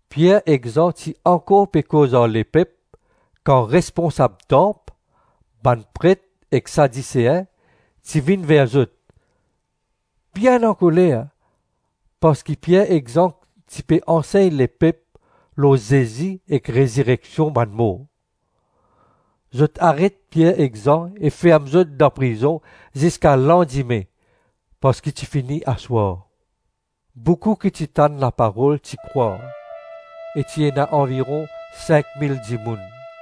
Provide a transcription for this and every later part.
Pier ek Zan ti ankor pe koz ar lepep, kan responsab tanp, bann pret ek Sadisein ti vinn ver zot, bien ankoler parski Pier ek Zan ti pe ansegn lepep lor Zezi ek rezireksion bann mor. Zot aret Pier ek Zan e ferm zot dan prizon ziska landime parski ti fini aswar. Boukou ki ti tann laparol ti krwar, e ti ena anviron sink mil dimoun.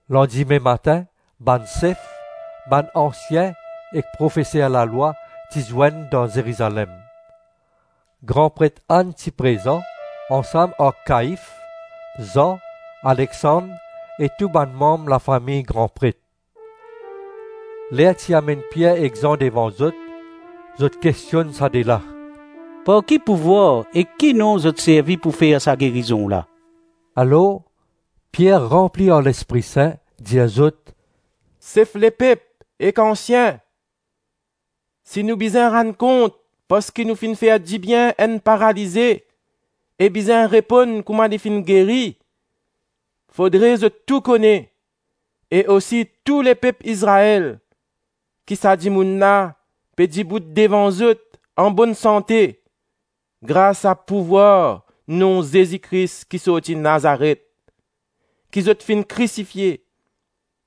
Landime matin, bann sef, bann ansien ek profeser lalwa ti zwenn dan Zerizalem. Gran Pret Ann ti prezan, ansam ar Kaif, Zan, Alexand e tou bann manm lafami gran pret. Ler ti amenn Pier ek Zan devan zot, zot kestionn sa de la, “Par ki pouvwar ek ki nom zot servi pou fer sa gerizon la?” Alor, Pier ranpli ar Lespri Sin dir zot, “Sef lepep ek ansien, si nou bizin rann kont parski nou finn fer dibien enn paralize e bizin reponn kouma li finn geri, fodre zot tou kone, e osi tou lepep Izrael, ki sa dimoun la pe dibout devan zot anbonn sante grasa pouvwar nom Zezi Kris ki sorti Nazaret, ki zot finn krisifie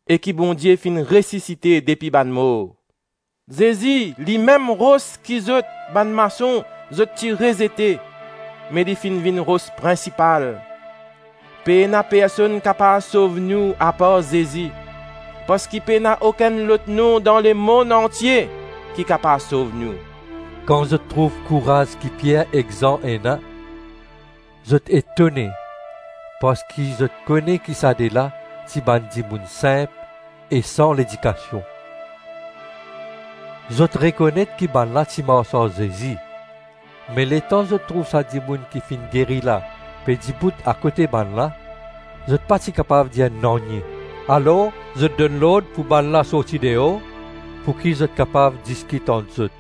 e ki Bondie finn resisite depi bann mor. Zezi ‘Limem ros ki zot, bann mason, zot ti rezete me li finn vinn ros prinsipal.’ Pena personn kapav sov nou apar Zezi, parski pena okenn lot nom dan lemonn antie ki kapav sov nou.” Kan zot trouv kouraz ki Pier ek Zan ena, zot etone parski zot kone ki sa de la ti bann dimoun sinp e san ledikasion. Zot rekonet ki bannla ti mars ar Zezi. Me letan zot trouv sa dimoun ki finn geri la pe dibout akote bannla, zot pa ti kapav dir nanye. Alors zot donn lord pou bannla sorti deor, pouki zot kapav diskit ant zot.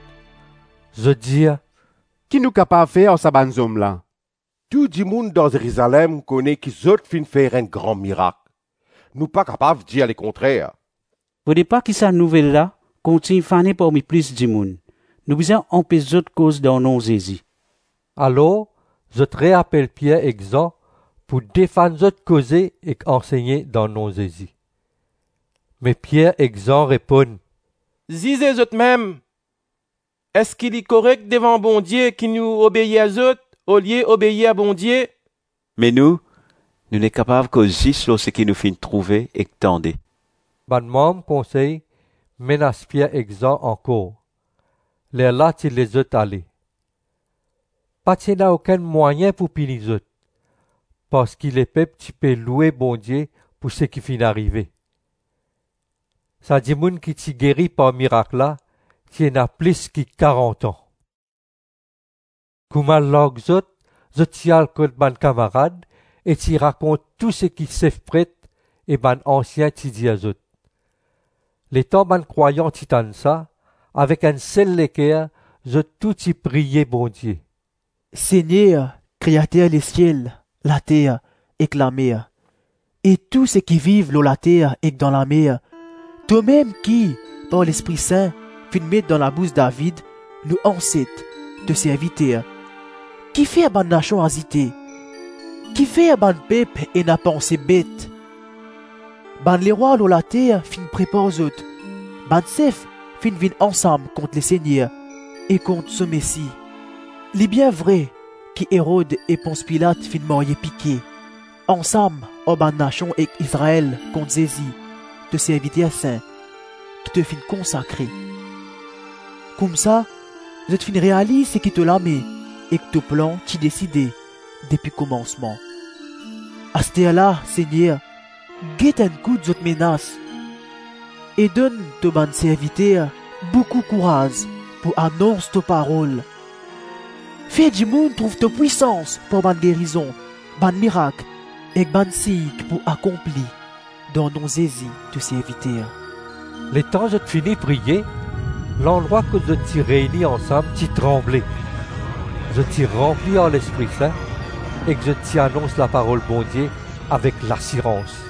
Zot dir, “Ki nou kapav fer ar sa bann zom la? Tou dimoun dan Zerizalem kone ki zot finn fer enn gran mirak. Nou pa kapav dir lekontrer. Fode pa ki sa nouvel la kontign fane parmi plis dimoun. Nou bizin anpes zot koz dan nom Zezi.” Alors zot reapel Pier ek Zan pou defann zot koze ek ansegne dan nom Zezi. Me Pier ek Zan reponn, “Zize zotmem, eski li korek devan Bondie ki nou obeir zot olie obeir Bondie? Me nou, nou nek kapav koz zis lor seki nou finn trouve ek tande.” Bann manm konsey menas Pier ek Zan ankor; lerla ti les zot ale. Pa ti ena okenn mwayin pou pini zot, parski lepep ti pe loue Bondie pou seki finn arive. Sa dimoun ki ti geri par mirak la ti ena plis ki karant-an. Kouma larg zot, zot ti al kot bann kamarad e ti rakont tou seki sef pret e bann ansien ti dir zot. Letan bann krwayan ti tann sa, avek enn sel leker zot tou ti priye Bondie, “Segner, Kreater lesiel, later, ek lamer e tou seki viv lor later ek dan lamer, tomem ki, par Lespri Sin, finn met dan labous David, nou anset, to serviter, ‘Kifer bann nasion azite? Kifer bann pep ena panse bet? Bann lerwa lor later finn prepar zot, bann sef finn vinn ansam kont Lesegner e kont so Mesi.’ Li bien vre ki Erod e Pons Pilat finn marye pike, ansam ar bann nasion ek Izrael, kont Zezi, to serviter sin, ki to finn konsakre. Koumsa, zot finn realiz seki to lame ek to plan ti deside depi komansman. Asterla, Segner, get enn kout zot menas, e donn to bann serviter boukou kouraz pou anons to parol. Fer dimoun trouv to pwisans par bann gerizon, bann mirak, ek bann sign, ki pou akonpli dan nom Zezi to serviter.” Letan zot fini priye, landrwa kot zot ti reyni ansam ti tranble. Zot ti ranpli ar Lespri Sin ek zot ti anons laparol Bondie avek lasirans.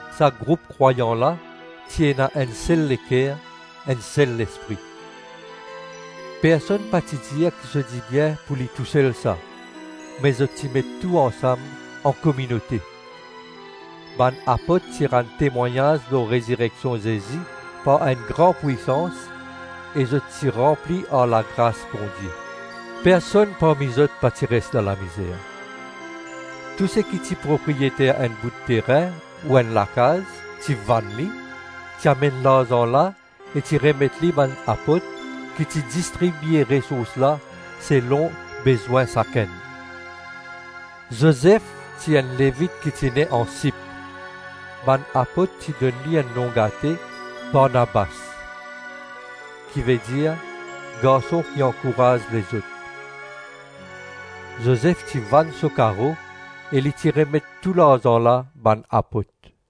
Sa group krwayan la ti ena enn sel leker, enn sel lespri; personn pa ti dir ki so dibien pou li tousel sa, me zot ti met tou ansam ankominote. Bann apot ti rann temwagnaz lor rezireksion Zezi par enn gran pwisans, ek zot ti ranpli ar lagras Bondie. Personn parmi zot pa ti res dan lamizer. Tou seki ti propriyeter enn bout terin ou enn lakaz ti vann li, ti amenn larzan la e ti remet li bann apot, ki ti distribie resours la selon bezwin sakenn. Zozef ti enn Levit ki ti ne an Sip, bann apot ti donn li enn nom gate Barnabas, ki vedir ‘Garson ki ankouraz lezot.’ Zozef ti vann so karo e li ti remet tou larzan la bann apot.